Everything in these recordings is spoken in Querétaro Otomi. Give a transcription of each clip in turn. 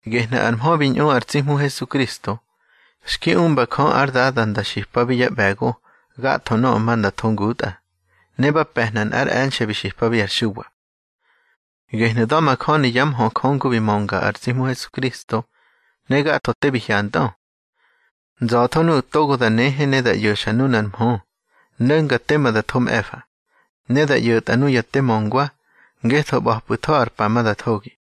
Gehnu̱ ar mhö bi ꞌñu ar tsi Hmu Hesukristo, xki umba Jö ár Dada nda xipabi yá ꞌbe̱go gatho nöꞌö ma nda tho ngutꞌa, ne ba pe̱hna nꞌár e̱nxe̱ bi xipabi ar Xuwa. Gehnu̱ da̱majöni yá mhö Jö ngu bi mönga ar tsi Hmu Hesukristo, ne gatho te bi hyantꞌö. Nza̱tho nuꞌu̱ togo da nehe ne da ꞌyo̱xa nunar mhö no̱nga tema da tho mꞌe̱fa, ne da ꞌyo̱tꞌa nuya te möngwa, ngetho ꞌba̱pꞌu̱tho ar pa ma da thogi.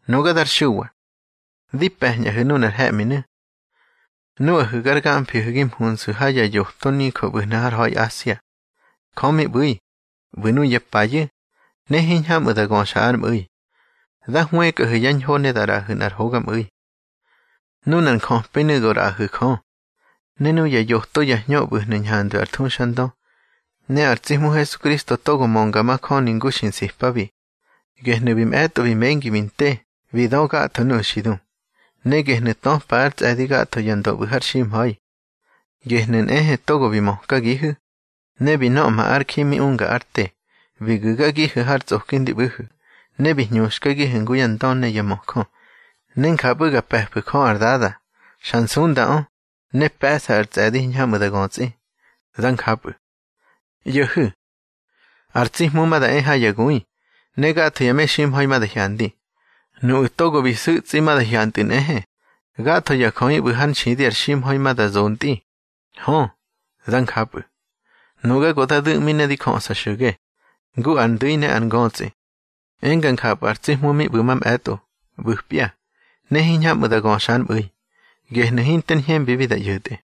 Nuga dar Xuwa, di pe̱ñꞌahu̱ nunar he̱ꞌminu̱, nuꞌahu̱ gar gamfihu̱ gi mhunsu̱ ha ya yoto nijö ꞌbu̱hnu̱ har ha̱i Asia. Jö mi ꞌbu̱i, ꞌbu̱ nuya payu̱, ne hiñhamꞌu̱ da göxa ár mꞌu̱i, da hwëkꞌahu̱ yá ñho ne da ꞌraꞌahu̱ nꞌar hogamꞌu̱i. Nunar njöpinu̱ go ꞌraꞌahu̱ Jö, ne nuya yoto ya hñö ꞌbu̱hnu̱ ñhandwi ár thuxandö, ne ar tsi Hmu Hesukristo togo mönga majöni ngu xi nsipabi. Gehnu̱ bi mꞌe̱tꞌo bi mengi bi nte bi dö gatho nuꞌu̱ xi du. Ne gehnu̱ töpa ár tsꞌe̱di gatho ya ndö ꞌbu̱ har ximha̱i. Gehnu̱ nꞌehe togo bi mökagihu̱, ne bi nöꞌma ár ji mi unga ár te, bi gu̱gagihu̱ har tsꞌoki ndi ꞌbu̱hu̱. Ne bi hñuxkagihu̱ ngu ya ndö ne ya möjö, ne njapꞌu̱ ga pe̱fu̱ Jö ár Dada. Xa nsundaꞌö, ne pe̱ꞌsa ar tsꞌe̱di hiñhamꞌu̱ da götsꞌi. Dá njapꞌu̱. ꞌYo̱hu̱, ar tsi Hmu ma da e ha ya gui, ne gatho ya meximha̱i ma da hyandi. Nuꞌu̱ togo bi su̱tsꞌi ma da hyantꞌu̱ nꞌehe. Gatho ya jöꞌi ꞌbu̱ hár nxidi ar ximha̱i ma da zontꞌi. Hö, dá njapꞌu̱. Nuga go da du̱ꞌmi ne di jöꞌsa xo̱ge, ngu ar ndu̱i ne ar ngötsꞌi, enga njapꞌu̱ ar tsi Hmu mi ꞌbu̱ mamꞌe̱tꞌo, ꞌbu̱pya, ne hiñhamꞌu̱ da göxa ár mꞌu̱i, gehnu̱ hinter ñhembibi da ꞌyo̱tꞌe.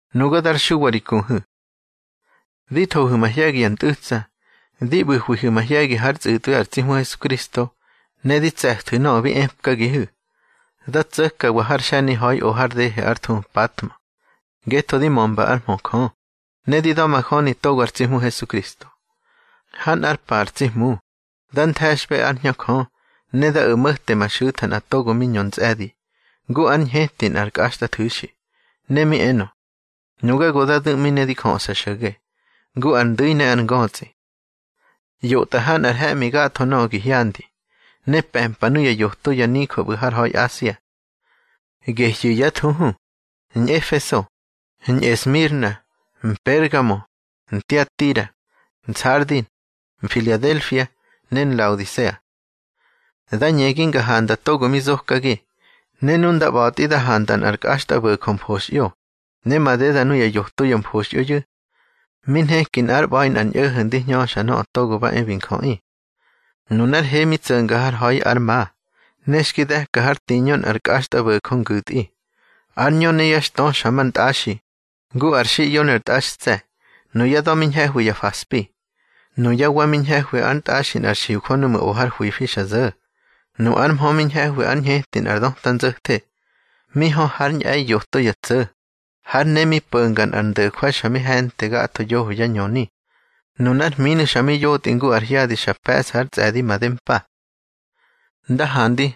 Nuga dar Xuwa ri kuhu̱, di thohu̱ mahye̱gi ya ntꞌu̱tsa, di ꞌbu̱hwihu̱ mahye̱gi hár tsꞌu̱tꞌwi ar tsi Hmu Hesukristo, ne di tse̱thu̱ nöꞌö bi epkagihu̱. Dá tso̱kawa har xe̱ni ha̱i o har dehe ár thuhu Mpatmo, ngetho di mömba ár mhö Jö, ne di da̱majöni togo ar tsi Hmu Hesukristo. Ha nꞌár pa ar tsi Hmu, da nthe̱xꞌbe ár Hñö Jö, ne da o̱ mo̱te ma xu̱tha nꞌa togo mi ñö ntsꞌe̱di, ngu ár ñheti nꞌar kꞌaxtꞌathu̱xi. Ne mi enö: —Nuga go da du̱ꞌmi ne di jöꞌsa xo̱ge, ngu ar ndu̱i ne ar ngötsꞌi. ꞌYotꞌa ha nꞌar he̱ꞌmi gatho nöꞌö gi hyandi, ne pe̱mpa nuya yoto ya nijö ꞌbu̱ har ha̱i Asia. Gehyu̱ yá thuhu: Ñꞌefeso, Ñꞌesmirna, Mpergamo, Ntiatira, Nsardi, Mfiladelfia, ne Nlaodisea. Da ñegi nga handa togo mi zokagi, ne nu nda ꞌba̱tꞌi da handa nꞌar kꞌaxtꞌabo̱jö mfoxꞌyo. Ne madeda nuya yoto ya mfoxꞌyoyu̱, mi nheki nꞌár ꞌba̱i nꞌar ñꞌo̱ho̱ ndi hñöxa Nöꞌö Togo ba e bi Njöꞌi. Nunár he mi tso̱nga har ha̱i ár ma, ne xki de̱ka hár tiñö nꞌar kꞌaxtꞌabo̱jö ngu̱tꞌi. Ár ñö ne yá xtö xa mar ntꞌaxi, ngu ar xiꞌyo ne ar tꞌaxtse̱. Nuyá da̱ mi ñhe̱hwi ya faspi. Nuyá wa mi ñhe̱hwi ár ntꞌaxi nꞌar xiujö núꞌmu̱ o har hwifi xa zo̱. Nu ár mhö mi ñhe̱hwi ár ñheti nꞌar döta nzo̱the. Mi hö hár ñꞌe̱i yoto ya tso̱. Hár ne mi po̱nga nꞌar ndo̱jwai xa mi he̱nte gatho yoho yá ñöni. Nunár hminu̱ xa mi yotꞌi ngu ar hyadi xa pe̱ꞌsa ar tsꞌe̱di madempa. Nda handi,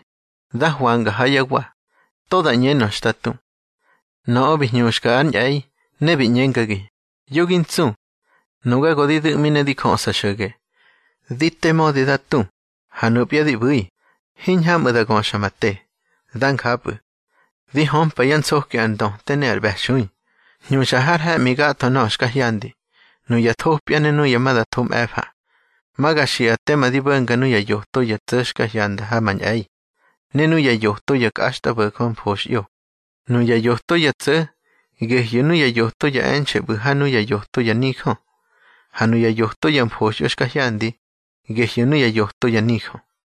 da hwanga ha yá wa, to da ꞌñenö xta tu. Nöꞌö bi hñuxka ár ñꞌe̱i, ne bi ꞌñengagi: —Yo gi ntsu. Nuga go di du̱ꞌmi ne di jöꞌsa xo̱ge. Di te mödi da tu, ha nupya di ꞌbu̱i, hiñhamꞌu̱ da göxa ma te. Dá njapꞌu̱. Di hömpa yá nsoki ar ndöte ne ar ꞌbe̱xui. Hñuxa har he̱ꞌmi gatho nöꞌö xka hyandi, nuya thopya ne nuya ma da tho mꞌe̱fa. Ma ga xiꞌa tema di bo̱nga nuya yoto ya tso̱ xka hyanda ha ma ñꞌe̱i, ne nuya yoto ya kꞌaxtꞌabo̱jö mfoxꞌyo: nuya yoto ya tso̱, gehyu̱ nuya yoto ya e̱nxe̱ ꞌbu̱ ha nuya yoto ya nijö. Ha nuya yoto ya mfoxꞌyo xka hyandi, gehyu̱ nuya yoto ya nijö.